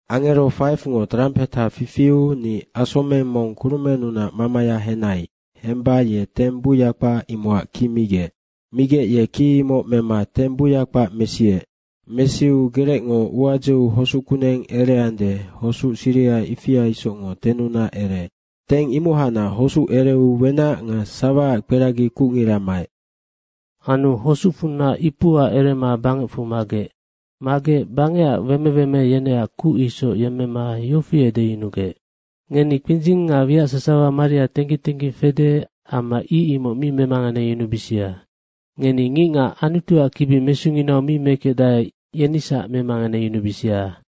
Angero 5ngo trampeha fifiu ni asomeng mong kurumennunac mamaya henai. Hemba ye teng buya kpac, imocac ki migec. Migec yeng ki imoc mema teng buya kpac mesiec. Mesiu gerecngo ua dzeu hosuc kuneng ereande, hosuc siriha ifia isocngo tennunac ereec. Teng imohacnac hosuc ereu wenac nga sawaac kperagi kucngira maec. Anu hosucfunac ipua erema bangecfu magec. Magec bangecac weme weme yeneac kuc isoc yemmema yofi edeyunugec, “Ngeni kpindzing nga wiac sasawa maria tengging tengging fede amma ic, imoc mi memanganebisia. Ngeni ngicngac Anutuac kibi mesunginau mi mekecdae, yenisac memanganeyunubisia.”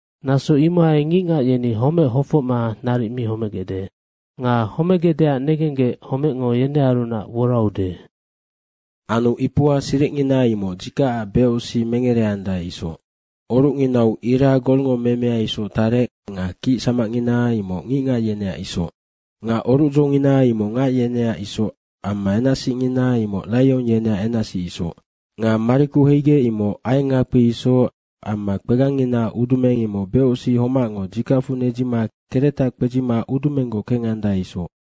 Naso imohai ngicngac yeni homec hofocma naric mi homegecde. Nga homegecdeac negenggec homecngo yenearunac woraude. Anu ipua siricngina imoc dzikacac becosic mengereandae isoc. Orucnginau ira golngo memea isoc tarec nga kic samacngina imoc ngicngac yeneac isoc. Nga orucdzongina imoc ngac yeneac isoc amma enacsicngina imoc raiong yeneac enacsic isoc. Nga mariku heigec, imoc aiengngakpi isoc amma kpegangnginaac udumeng imoc becosic homacngo dzikacfu nedzima keretac kpedzima udumenggoc kengandae isoc.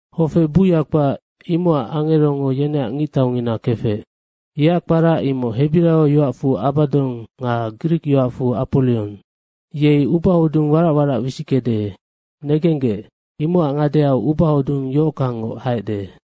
Hofe buya kpac, imocac angerongo yeneac ngictaungina kefec. Yeac kpara imoc hebiraio yoacfu Abadong nga grik yoacfu Aporiong. Yei ubahodung warac warac wisickede. Negenggec, imocac ngadeau ubahodung yohockangngoc haecde.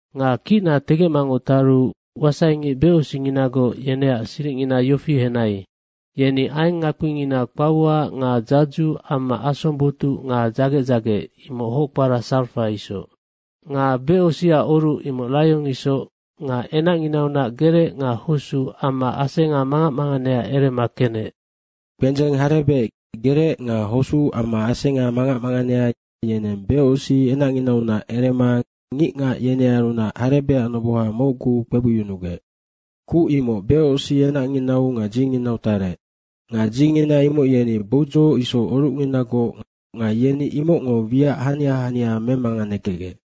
Nga kicna tegecmangoc taru wasaingic becosicnginagoc yeneac siricngina yofi henai, yeni aiengngakpingina kpaua nga dzadzu amma asong botuc nga dzagec dzagec, imoc hoc kpara sarafa isoc. Nga becosicac oruc imoc raiong isoc nga enacnginaunac gerec nga hosuc amma asenga mangac manganea erema kenec. Kpendzeng harebec, gerec nga hosuc amma asenga mangac manganea, yeneng becosic enacnginaunac erema ngicngac yenearunac harebecac noboha mocgu (⅓) kpebucyunugec. Kuc imoc becosic enacnginau nga dzinginau tarec. Nga dzingina imoc yeni boudzoc isoc orucnginagoc nga yeni imocngo wiac hania hania memanganekecgec.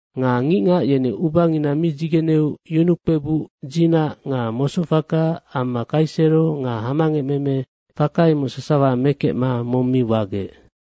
Nga ngicngac yeni ubangina mi dzigeneu yunukpebuc, dzinac nga mosoc faka amma kaisero faka nga hamangecmeme, faka imoc sasawa mekecma mong mi wagec.